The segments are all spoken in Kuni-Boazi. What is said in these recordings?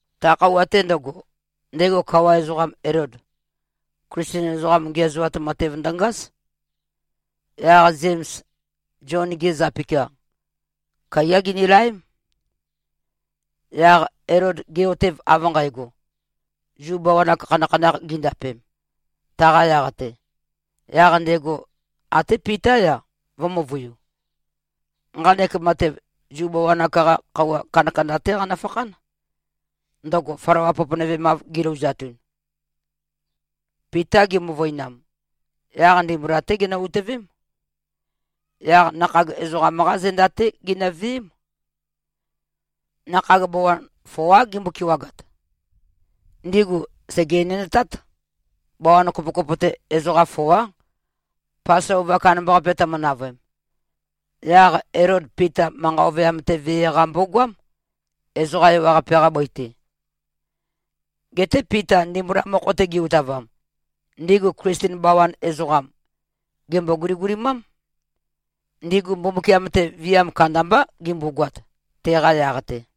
Ta khøuwa-te ndøgo, ndego kawa ezoqam Elod, Klisten ezoqam ngiæzoat matev ndøngáz. Yaq Zems, Zion-ge zapikia, kaiyá ginilaém. Yaq Elod ge꞉-otev av nqægo, Zu bawan-ak khanakhanakh gindapem, taqa yaq-te, yaq ndego até Pitá-ya, vø̄-møvøiu. Nqanek matev, Zu bawan-ak-qa khøuwa kandakanda-té qanøfakhán, ndøgo flawa poponøvemav gilouzatun. Pita gimøvøinam, yaq ndimbula-té ginø-utøvém. Yaq nakhag ezoqam-qá zenda-té ginøveém. Nakhag bawan foá gimbo-kewagat. Ndigu sège-enendtát. Bawan kopokopo-te ezoqa foá. Pasova kandambaqape tømø-navøem, yaq Elod Pita manqa ovøyam-te vee-qa mbogoám, ezoqa ewaqape-qa bøi-te. Geté Pita ndimbula mokho-te ge-utavam, ndigu Klisten bawan ezoqam, gèmbo-guligulimám. Ndigu Mbumbukiam-te viam kandambá gimbogoat, teqa yaq-te.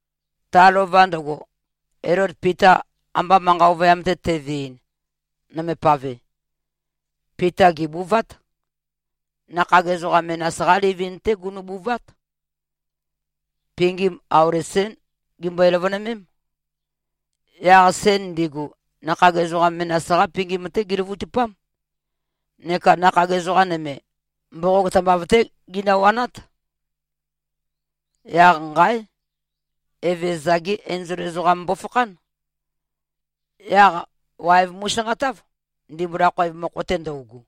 Ta lova ndøgo, Elod Pita amba manqa ovøyam-te teveɨn, nøme pave, Pita gèbuvát. Nakhag ezoqa menas-qá livin-té gunubuvát. Pingim auli sén gimbøe-løvønømém. Yaq sen ndigu, nakhag ezoqa menas-qá pingim-te giløvøtupám. Neka nakhag ezoqa nøme, mboqog tambav-té ginøwanát. Yaq nqáe! Evezøza-gé enzol ezoqam mbofakhán. Yaq waev mu꞉sanqatáv, ndimbula khoev mokho-te ndøugu.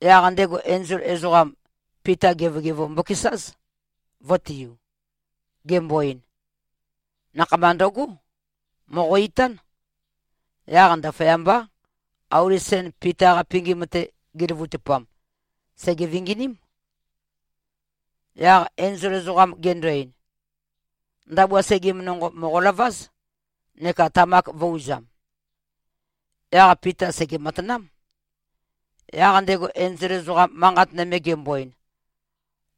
Yaq ndego enzol ezoqam, Pita gevogevo mbokesáz, vø̄tiu, gembo-ein, “Nakhama ndøgó! Mòqo-itán!” Yaq ndaføyambá, auli sen Pita-qa pingim-te giløvøtupam, sège-vinginím. Yaq enzol ezoqam gendo-ein, “Ndabua segim nonqo mòqolováz, neka tamak vø̄-uzam.” Yaq Pita sège-matanám. Yaq ndego enzol ezoqam manqat nøme gembo-ein,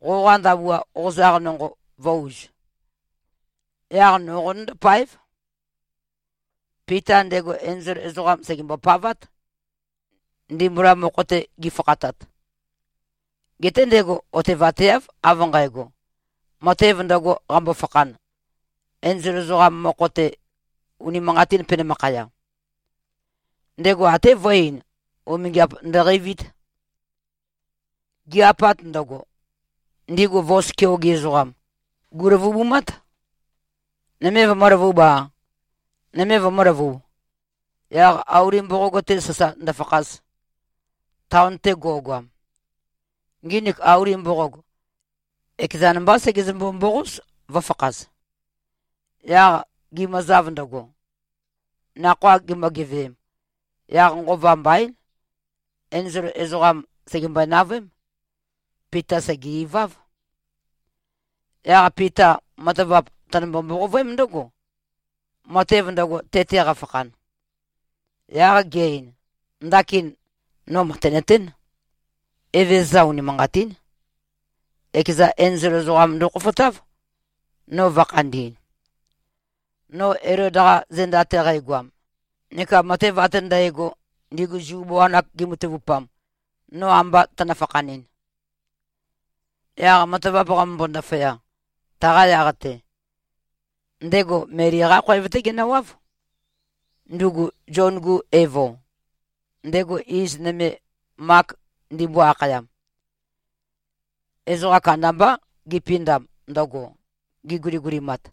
“Qoqa ndabua qozaq nonqo vø̄-uz. Yaq no qonøndó-páev.” Pita ndego enzol ezoqam sègembo-pavát, ndimbula mokho-te gifakhatat. Geté ndego otevateáv, av nqægo, matev ndøgo qambo-fakhan, enzol ezoqam mokho-te, unimanqatīn penømakhaya. Ndego até vø̄e-ein, umingiap ndøqeivīt. Gi-apat ndøgo, ndigu vos keoge ezoqam, gù꞉løvubumát, nøme vømø̄løvub-a, nøme vømø̄løvub, yaq auli mboqog-te sasa ndøfakhaz, taon-te go꞉goam. Nginik auli mboqog, ekezan mbá segezømbo-mboqóz, vø̄fakhaz. Yaq gimøzav ndøgo, nakhoa gimø-geveem, yaq nqova mbaín, enzol ezoqam, sègembøe-navøém. Pita sège-iváv. Yaq Pita matavap tønømbo-mboqovøém ndǿgo, matev ndøgo, te-te qafakhan. Yaq ge-ein, “Ndakin, no mø̀tenøtén. Evezøza unimanqatín, ekeza enzol ezoqam ndokhofotáv, no vø̄khandi꞉n, no Elod-qa zenda-te qægoam, neka matev ate ndægo, ndigu Zu bawan-ak gimatavupam, no amba tønø-fakhanɨn.” Yaq matavap qamømbo-ndaføya, taqa yaq-te, ndego Meli-qá khoev-té genøwáv, ndugu Zion-gu evo, ndego iz nøme Mak ndimbo-akhayam. Ezoqa kandambá gipindam ndøgo, giguligulimat.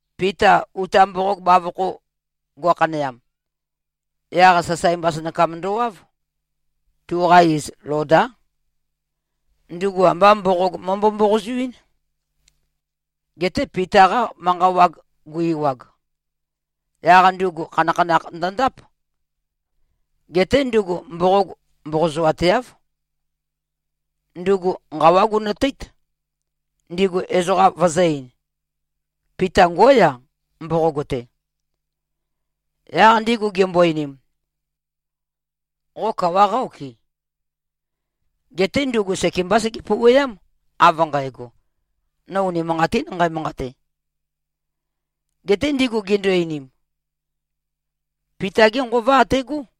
Pita uta mboqog bavokho go꞉khaneam, yaq sasae mbasønakam ndowáv. Tuqa iz Lodá. Ndugu ambá mboqog mømbo-mboqozoɨ́n. Geté Pita-qa manqa wag gu-ewag, yaq ndugu khanakhanakh ndøndáp. Geté ndugu mboqog mboqozoateáv. Ndugu nqawá gunøteít, ndigu ezoqa vøzø̄-ein, “Pita ngóya, mboqog-te.” Yaq ndigu gimbo-einim, “Qo kawa qá-okɨ?” Geté ndugu sekembá sege-pouweám, av nqægo, “No unimanqatín nqæmanqate!” Geté ndigu gindu-einim, “Pita-gé nqova ategó!”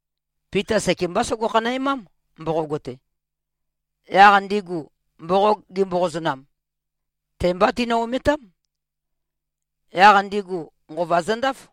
Pita sekembá sogo-khanæmám, mboqog-te. Yaq ndigu mboqog gimboqozønam, te-mbá tinø-ometám. Yaq ndigu nqova zøndáf.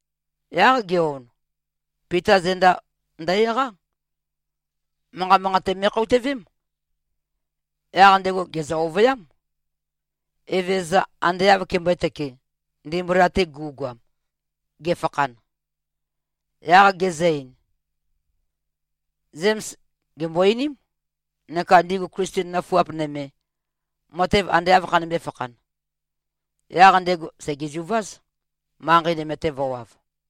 Yaq ge-on, Pita zenda ndø-eqá. Manqa manqate me꞉khoutøvém. Yaq ndego gèzø-ovøyám, Evezøza ande āv kembø̄e-tøke, ndimbula-te gu꞉goam, ge꞉fakhan. Yaq gezø-ein, “Zems gèmbo-einím, neka ndigu Klisten nøfuap nøme, matev ande āv khanømbē-fakhan.” Yaq ndego sègezuváz, manqei nøme-te vø̄wav.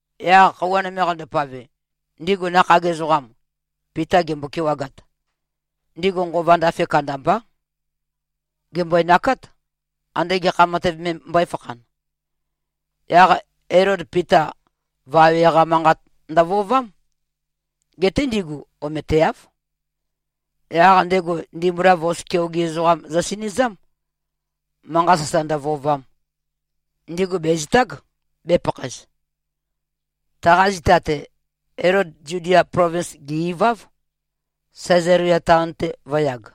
Yaq khøuwa nøme qandopave, ndigu nakhag ezoqam Pita gimbo-kewagat, ndigu nqova ndafe kandambá. Gèmbøenakát, ande gekha matev me mbøéfakhan. Yaq Elod Pita vawe-qá manqat ndøvøovám. Geté ndigu ometeáv. Yaq ndego, ndimbula vos keoge ezoqam zøsinøzám, manqa sasa ndøvøovam, ndigu bèzitág, bēpakhaez. Taqa zita-te, Elod Zudia plovins gè-iváv, Sæzalia taon-te vø̄yag.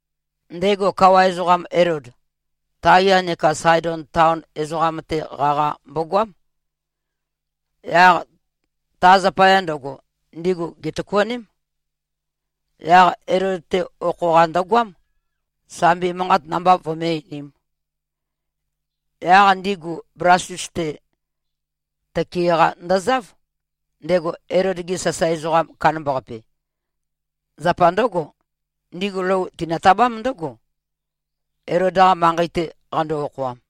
Ndego kawa ezoqam Elod, Taya neka Saedon taon ezoqam-te qaqa mbogoám. Yaq ta zapaya ndøgo, ndigu gètøkuaném. Yaq Elod-te okho-qa ndøgoám, sambi manqat namba vømé-einīm. Yaq ndigu Blastus-te tøke-qa ndøzáv, ndego Elod-ge sasae ezoqam kandambaqape. Zapa ndǿgo, ndigu lou tinotabám ndǿgo, Elod-qa manqei-te qando-okhoam.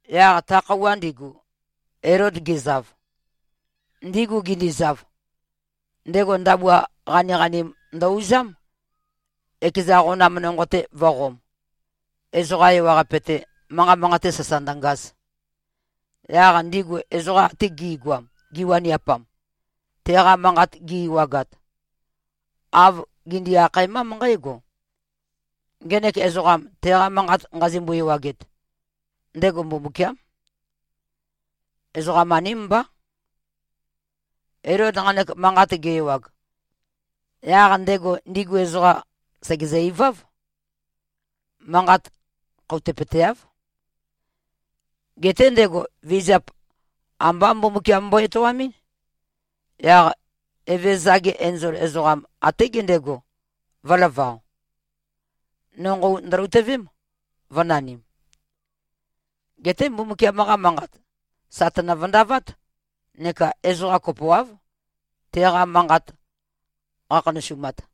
Yaq ta khøuwa ndigu, Elod gezav, ndigu gindizav, ndego ndabua qaniqanim ndø-uzám, ekeza qonam nonqo-te vø̄qom, ezoqa ewaqape-te, manqa manqate sasa ndøngaz. Yaq ndigu ezoqam ate gi꞉goam, giwaniapam, teqa manqat gi-ewagat, āv gindi-akhaemám nqǽgo, “Ngenek ezoqam, teqa manqat nqazimbo-ewaget, ndego mbumbukiám. Ezoqam-aním mbá.” Elod nqanek manqat ge-ewag, yaq ndego ndigu ezoqam sègezø-iváv. Manqat khoutøpøteáv. Geté ndego vizap ambá Mbumbukiam mbo-etoamɨ́n. Yaq Evezøza-ge enzol ezoqam, até gendego, vø̄lavao. Nonqou ndøloutøvém, vø̄nanim. Geté Mbumbukiam-qa Manqat sà tønø-vøndavát neka ezoqa kopoáv, teqa manqat qakhanøsumat.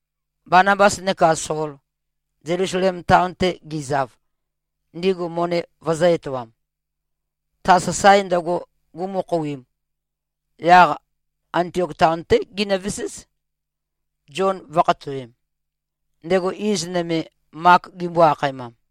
Banabas neka Sol, Zelusalem taon-te gizav, ndigu moni vøzø̄-etoam, ta sasae ndøgo gumø-khouim, yaq Antiok taon-té ginøveséz, Zion vø̄khatowem, ndego iz nøme, Mak gimbo-akhaemam.